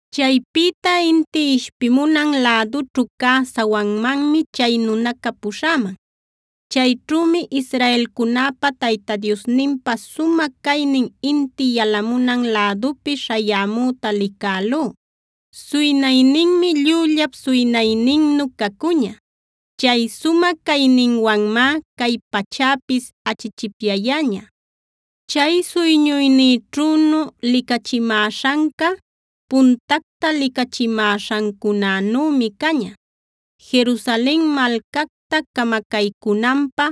Chaypïta inti ishpimunan lädućhu cä sawanmanmi chay nunaca puśhäman. Chayćhümi israelcunäpa Tayta Diosninpa sumä caynin inti yalamunan lädupi śhayämüta licälú. Suynayninmi llüllap suynayninnu cacuña. Chay sumä cayninwanmá cay pachäpis achichipyayäña. Chay suyñuynïćhünu licachimäśhanca puntacta licachimäśhancunänümi caña. Jerusalen malcacta camacaycünanpä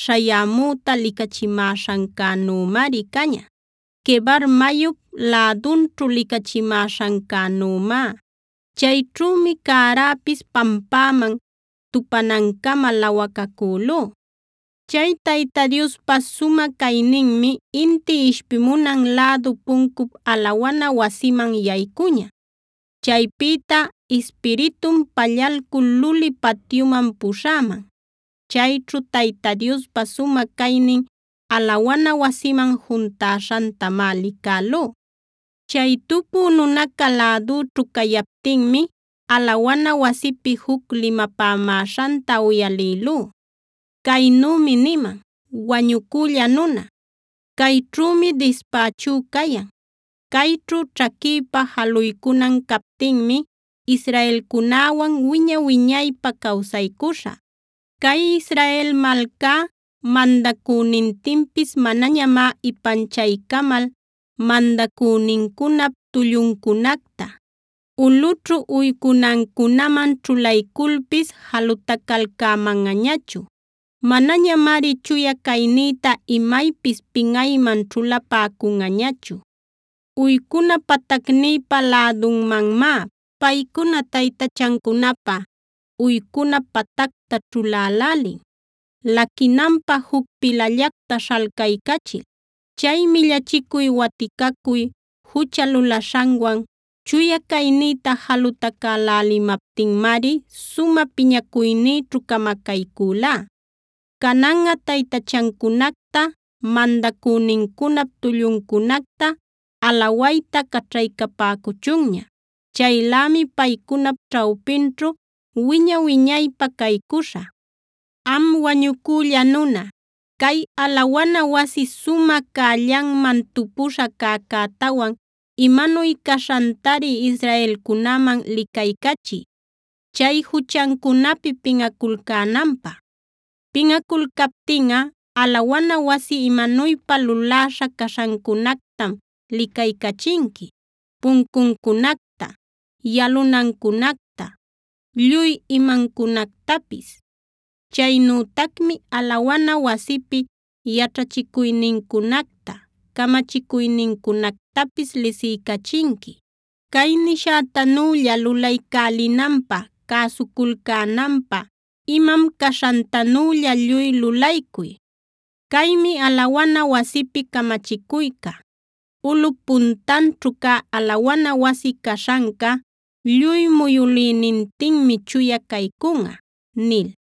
śhayämüta licachimäśhancänümari caña, Quebar mayup lädunćhu licachimäśhancänümá. Chayćhümi cäräpis pampäman tupanancama lawacacülú. Chay Tayta Diospa sumä cayninmi inti ishpimunan lädu puncup alawana wasiman yaycuña. Chaypïta Ispiritum pallalcul luli patyuman puśhäman. Chayćhu Tayta Diospa sumä caynin alawana wasiman juntäśhantamá licälú. Chay tupü nunaca lädüćhu cayaptinmi alawana wasipi juc limapämäśhanta uyalïlú. Caynümi niman: “Wañucülla nuna, cayćhümi dispächú cayan. Cayćhu ćhaquïpa jaluycunan captinmi israelcunäwan wiña-wiñaypä cawsaycuśhä. Cay Israel malcá mandacünintinpis manañamá ipanchaycamal mandacünincunap tulluncunacta, ulꞌućhu uycunancunaman ćhulayculpis jalutacalcämanꞌañachu. Manañamari chuya caynïta imaypis pinꞌayman ćhulapäcunꞌañachu. Uycuna patacnïpä lädunmanmá paycuna taytachancunapä uycuna patacta ćhulälälin, laquinanpä juc pilallacta śhaycaycachil. Chay millachicuy waticacuy jucha lulaśhanwan chuya caynïta jalutacäläliptinmari sumä piñacuynïćhu camacaycülá. Cananꞌa taytachancunacta, mandacünincunap tulluncunacta alawayta caćhaycapäcuchunña. Chaylämi paycunap ćhawpinćhu wiña-wiñaypä caycuśhä. “Am wañucülla nuna, cay alawana wasi sumä cällanman tupuśha cäcätawan imanuy caśhantari israelcunäman licaycachiy, chay juchancunapi pinꞌaculcänanpä. Pinꞌaculcaptinꞌa alawana wasi imanuypa luläśha caśhancunactam licaycachinqui: puncuncunacta, yalunancunacta, lluy imancunactapis. Chaynütacmi alawana wasipi yaćhachicuynincunacta, camachicuynincunactapis lisiycachinqui. Cay nishätanülla lulaycälinanpä, cäsuculcänanpä imam caśhantanülla lluy lulaycuy. Caymi alawana wasipi camachicuyca: ‘Ulꞌup puntanćhu cä alawana wasi caśhanca, lluy muyülïnintinmi chuya caycunꞌa’” nil.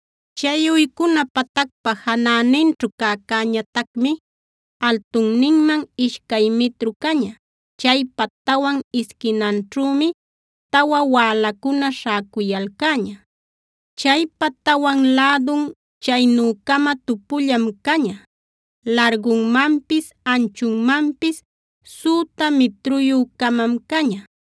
Chay uycuna patacpa janäninćhu cäcäñatacmi altunninman ishcay mitru caña. Chaypa tawan isquinanćhümi tawa wälacuna śhäcuyalcäña. Chaypa tawan lädun chaynü-cama tupullam caña. Largunmanpis, anchunmanpis süta mitruyü-camam caña.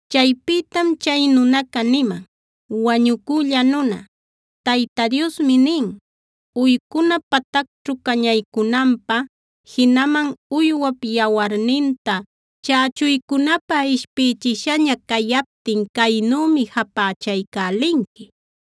Chaypïtam chay nunaca niman: “Wañucülla nuna, Tayta Diosmi nin: Uycuna patacćhu cañaycunanpä, jinaman uywap yawarninta chächuycunapä ishpïchishaña cayaptin caynümi japächaycälinqui: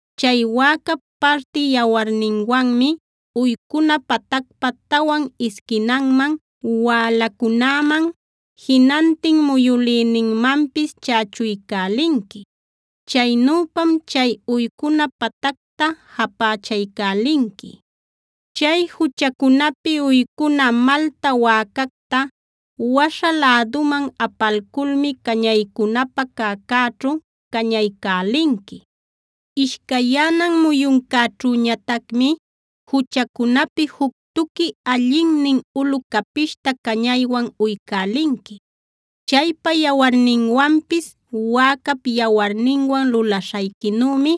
Chay wäcap parti yawarninwanmi uycuna patacpa tawan isquinanman, wälacunäman, jinantin muyülïninmanpis chächuycälinqui. Chaynüpam chay uycuna patacta japächaycälinqui. Chay juchacunapi uycuna malta wäcacta waśha läduman apalculmi cañaycunapä cäcäćhu cañaycälinqui. “Ishcayyänan muyuncäćhüñatacmi juchacunapi juc tuqui allinnin ulu capishta cañaywan uycälinqui. Chaypa yawarninwanpis wäcap yawarninwan lulaśhayquinümi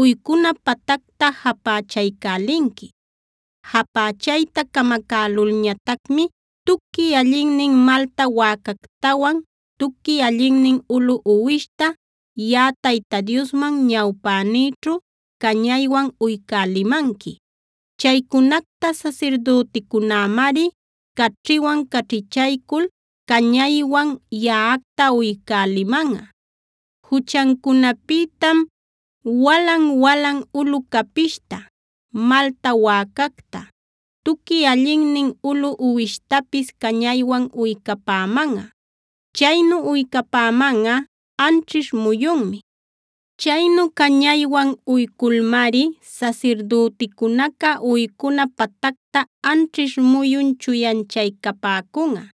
uycuna patacta japächaycälinqui. Japächayta camacälulñatacmi tuqui allinnin malta wäcactawan tuqui allinnin ulu uwishta, yaꞌa Tayta Diosman ñawpänïćhu cañaywan uycälimanqui. Chaycunacta sasirdüticunämari caćhiwan caćhichaycul cañaywan yaꞌacta uycälimanꞌa. Juchancunapïtam walan-walan ulu capishta, malta wäcacta, tuqui allinnin ulu uwishtapis cañaywan uycapämanꞌa. Chaynu uycapämanꞌa anćhish muyunmi. Chaynu cañaywan uyculmari sasirdüticunaca uycuna patacta anćhish muyun chuyanchaycapäcunꞌa.